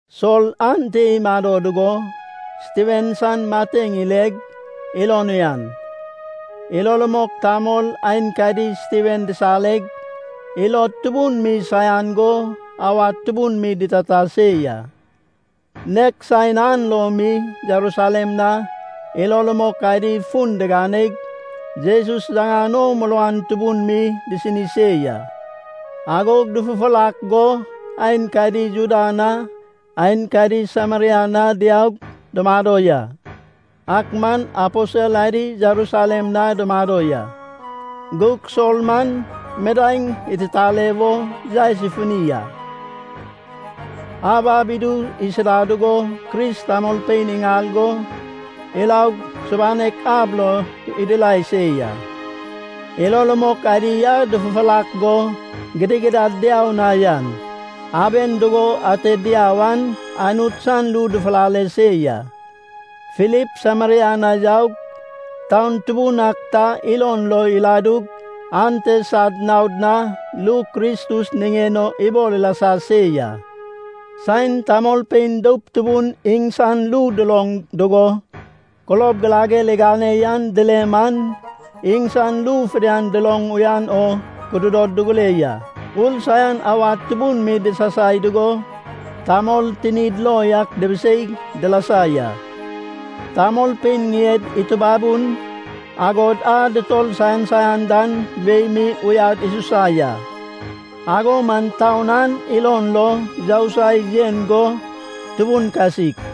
Sol ante imado dugo Stiven san mateŋ ileg, ilon uyan. Ilo rumok tamol aenkadi Stiven disareg, ilod tubun mi saian go awad tubun mi ditata se ya. Nek saen an lo mi Jerusalem na ilo rumok adi fun diganeg, Jesus yaŋan o muruan tubun mi disini se ya. Agog dufufurak go aenkadi Juda na aenkadi Sameria na diaug dumado ya. Ak man aposel adi Jerusalem na dumado ya. Gug Sol man midaeŋ ititale wo yaes ifuni a. Ab ab idu isida dugo Kris tamolpein iŋal go iraug subanek ab lo idirai se ya. Ilo rumok adi a dufufurak go gidigidad diau na yan, aben dugo ate diau an Anut san ru dufulale se ya. Filip Sameria na yaug, taun tubun ak ta ilon lo iladug ante sad naod na ru Kristus niŋen o ibol ilasa se ya. Saen tamolpein doup tubun iŋsan ru duloŋ dugo, kulob girager igane yan dile man, iŋsan ru fidian duloŋ uyan o kududod dugure ya. Ur saian awad tubun mi disasai dugo, tamol tinid lo yak dubiseig dilasa ya. Tamolpein ŋied itubabun, agod a dutor saian saian dan wei mi uyad isusa ya. Ago man taun an ilon lo yousai yen go tubun kasik.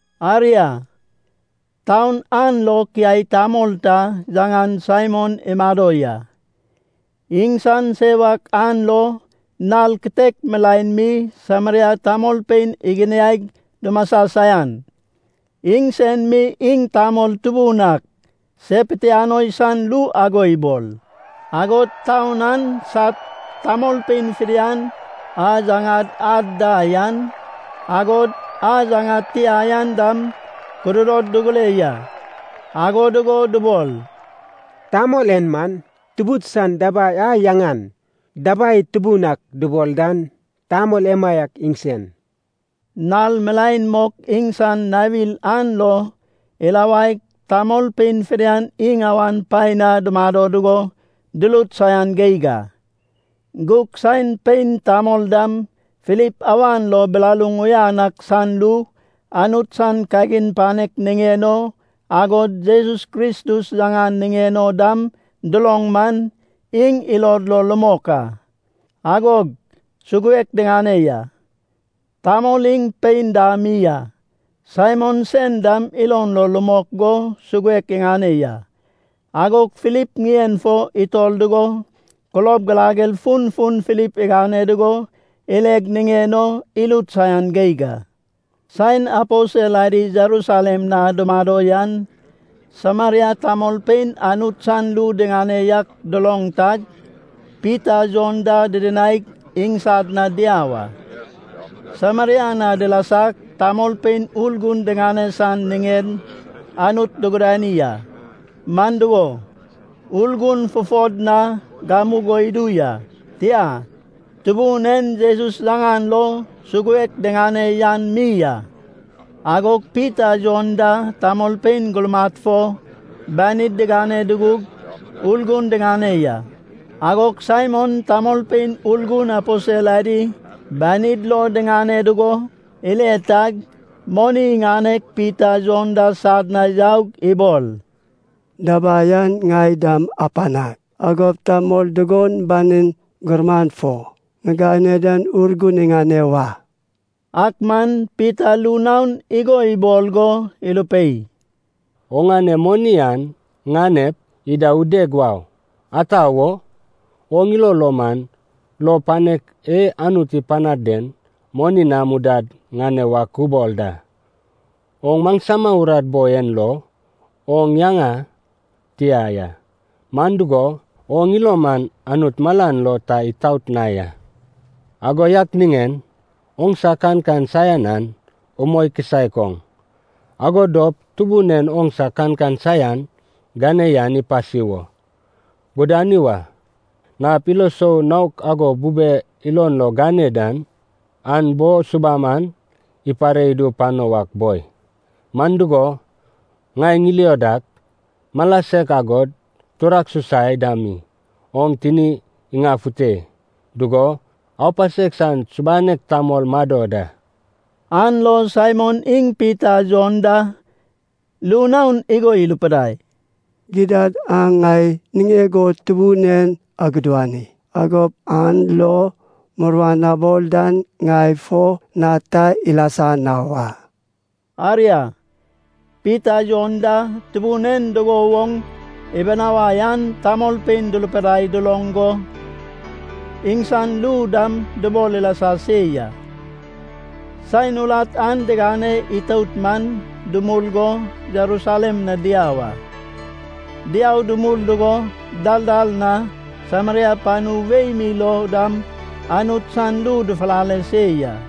Aria, taun an lo kiai tamol ta yaŋan Saimon imado ya. Iŋsan sewak an lo nal kitek milaen mi Sameria tamolpein iginiaig dumasa saian. Iŋsen mi iŋ tamol tubun ak se pitianoi san ru ago ibol. Agod taun an sad tamolpein fidian, a yaŋad ad da yan, agod a yaŋad tia yan dam, kududod dugure ya. Ago dugo dubol, “Tamol en man, tubud san dabai a yaŋan Dabai Tubun Ak dubol dan, tamol emaiak iŋsen.” Nal milaen mok iŋsan nawir an lo irawaig, tamolpein fidian iŋ awan paen na dumado dugo durut saian geig a. Gug saen pein, tamol dam Filip awan lo bilaluŋ uyan ak san ru Anut san kagin panek niŋen o, agod Jesus Kristus yaŋan niŋen o dam duloŋ man, iŋ ilod lo rumok a. Agog suguek diŋane ya, tamol iŋ pein da mi a. Saimon sen dam ilon lo rumok go suguek iŋane ya. Agog Filip ŋien fo itor dugo kulob girager funfun Filip igane dugo ileg niŋen o irut saian geig a. Saen aposel adi Jerusalem na dumado yan Sameria tamolpein Anut san ru diŋane yak duloŋ tag, Pita Jon da didinaig, iŋsad na diau a. Sameria na dilasag, tamolpein Urgun diŋane san niŋen Anut dugudani a. Man dugo, Urgun fufod na gamugo idu ya, tia, Tubun en Jesus yaŋan lo suguek diŋane yan mi a. Agog Pita Jon da tamolpein gurmad fo banid digane dugug, Urgun diŋane ya. Agog Saimon tamolpein Urgun aposel adi banid lo diŋane dugo ile tag, moni iŋaneg, Pita Jon da sad na yaug ibol, “Dabai an ŋai dam apanag. Agop tamol dugon banig gurman fo ŋigane dan Urgun iŋane wa.” Ak man Pita ru naon igo ibol go irupei, “Oŋane moni an ŋanep, ida udeg wau. Ata wo? Oŋ ilo lo man lou panek e Anut ipanad den moni nam udad ŋane wak ubol da. Oŋ maŋsama urat boi en lo oŋ yaŋa tia ya. Man dugo, oŋ ilo man Anut malan lo ta itaot na ya. Ago yak niŋen oŋsa kankan saian an umoi kisaek oŋ. Ago dop Tubun en oŋsa kankan saian gane yan ipasi wo gudani wa. Nap ilo sou naok ago bube ilon lo gane dan an bo subam an ipare idu pano wak boi. Man dugo, ŋai ŋilio dak, mala sek agod turak susai dam mi oŋ tini iŋanefute dugo, aupasek san subanek tamol mado da.” An lo Saimon iŋ Pita Jon da ru naon igo irupidai, “Gidad, aŋ ŋai niŋeg o Tubun en agudani. Agop an lo muruan abol dan ŋai fo na ta ilasa na wa.” Aria, Pita Jon da Tubun en dugo woŋ ibinawai an tamolpein durupidai duloŋ go iŋsan ru dam dubol ilasa se ya. Saen urat an digane itout man, dumul go Jerusalem na diau a. Diau dumul dugo dal dal na, Sameria panu wei mi lo dam Anut san ru dufulale se ya.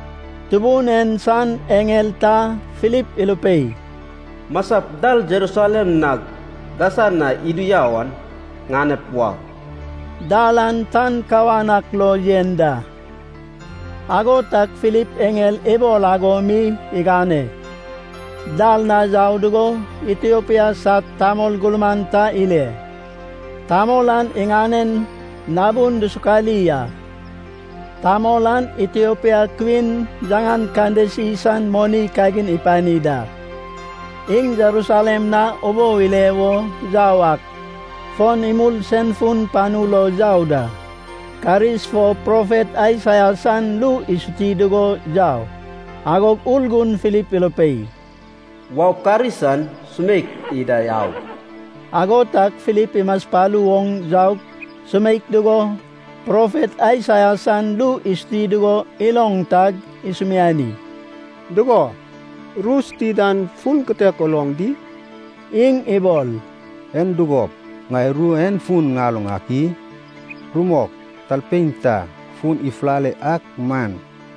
Tubun en san eŋel ta Filip irupei, “Masap dal Jerusalem nag Gasa na idu yau an ŋanep wau.” (Dal an tan kawan ak lo yen da.) Ago tag Filip eŋel ibol ago mi igane. Dal na yau dugo Itiopia sad tamol gurman ta ile, tamol an iŋanen nabun dusukali a. Tamol an Itiopia Kwin yaŋan Kandesi san moni kagin ipani da. Iŋ Jerusalem na ubou ile wo yau ak fon imul sen fun panu lo yau da. Karis fo profet Aisaia san ru isuti dugo yau. Agog Urgun Filip irupei, “Waup karis an sumeik ida au.” Ago tag Filip imaspalu oŋ yaug sumeik dugo, profet Aisaia san ru isuti dugo iloŋ tag isumiani, “Dugo, ru suti dan fun kitek uloŋ di?” Iŋ ibol, “En dugop ŋai ru en fun ŋaloŋ ak i? Rumok talpein ta fun ifulale ak man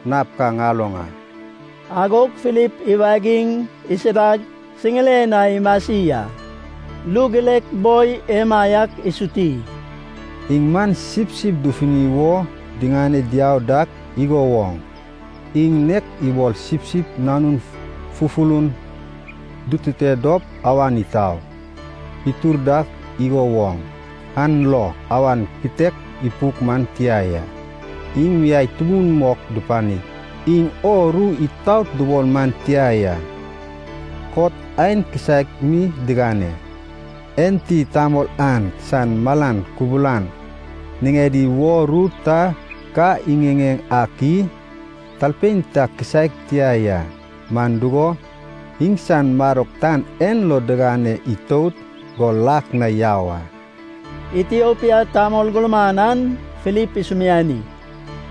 nap ka ŋaloŋ a.” Agog Filip iwagig isidag siŋiren na imasi a. Ru girek boi emaiak isuti, “Iŋ man sipsip dufuni wo diŋane diau dak igo woŋ. Iŋ nek ibol sipsip nanun fufulun dutute dop awan itau itur dak igo woŋ. An lo awan kitek ipuk man tia ya. Iŋ miai tubun mok dupanig, iŋ o ru itaot dubol man tia ya. Kot aen kisaek mi digane. Enti tamol an san malan kubulan niŋedi wo ru ta ka iŋiŋeŋ ak i? Talpein ta kisaek tia ya. Man dugo, iŋsan madok tan en lo digane itout go lak na yau a.” Itiopia tamol gurman an Filip isumiani,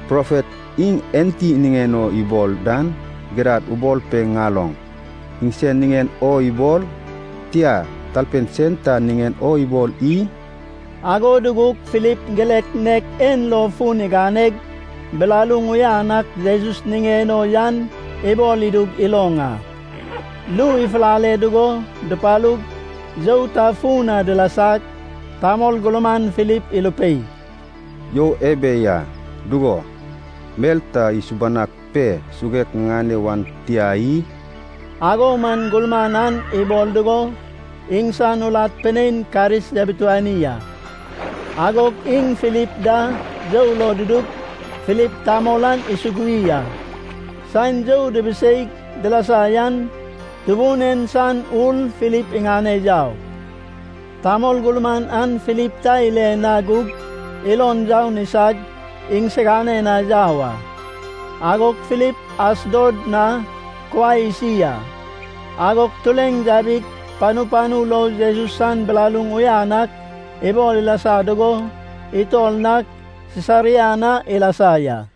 “Profet iŋ enti niŋen o ibol dan, gidad ubol pe ŋaloŋ. Iŋsen niŋen o ibol, tia, talpein sen ta niŋen o ibol i?” Ago dugug Filip girek nek en lo fun iganeg bilaluŋ uyan ak Jesus niŋen o yan ibol idug iloŋ a. Ru ifulale dugo dupalug you ta fun na dilasag, tamol gurman Filip irupei, “You ebe ya. Dugo, mel ta isubanag pe suguek ŋiŋane wan tia i?” Ago man gurman an ibol dugo iŋsan urat pinein karis yabituani a. Agog iŋ Filip da you lo dudug Filip tamol an isugui a. Saen you dibiseig dilasa yan Tubun en san Ur Filip iŋane yau. Tamol gurman an Filip ta ile na gug ilon youn isag iŋsiganen na yau a. Agog Filip Asdod na kuai isi a. Agog tureŋ yabig panu panu lo Jesus san bilaluŋ uyan ak ibol ilasa dugo itor nag Sisaria na ilasa ya.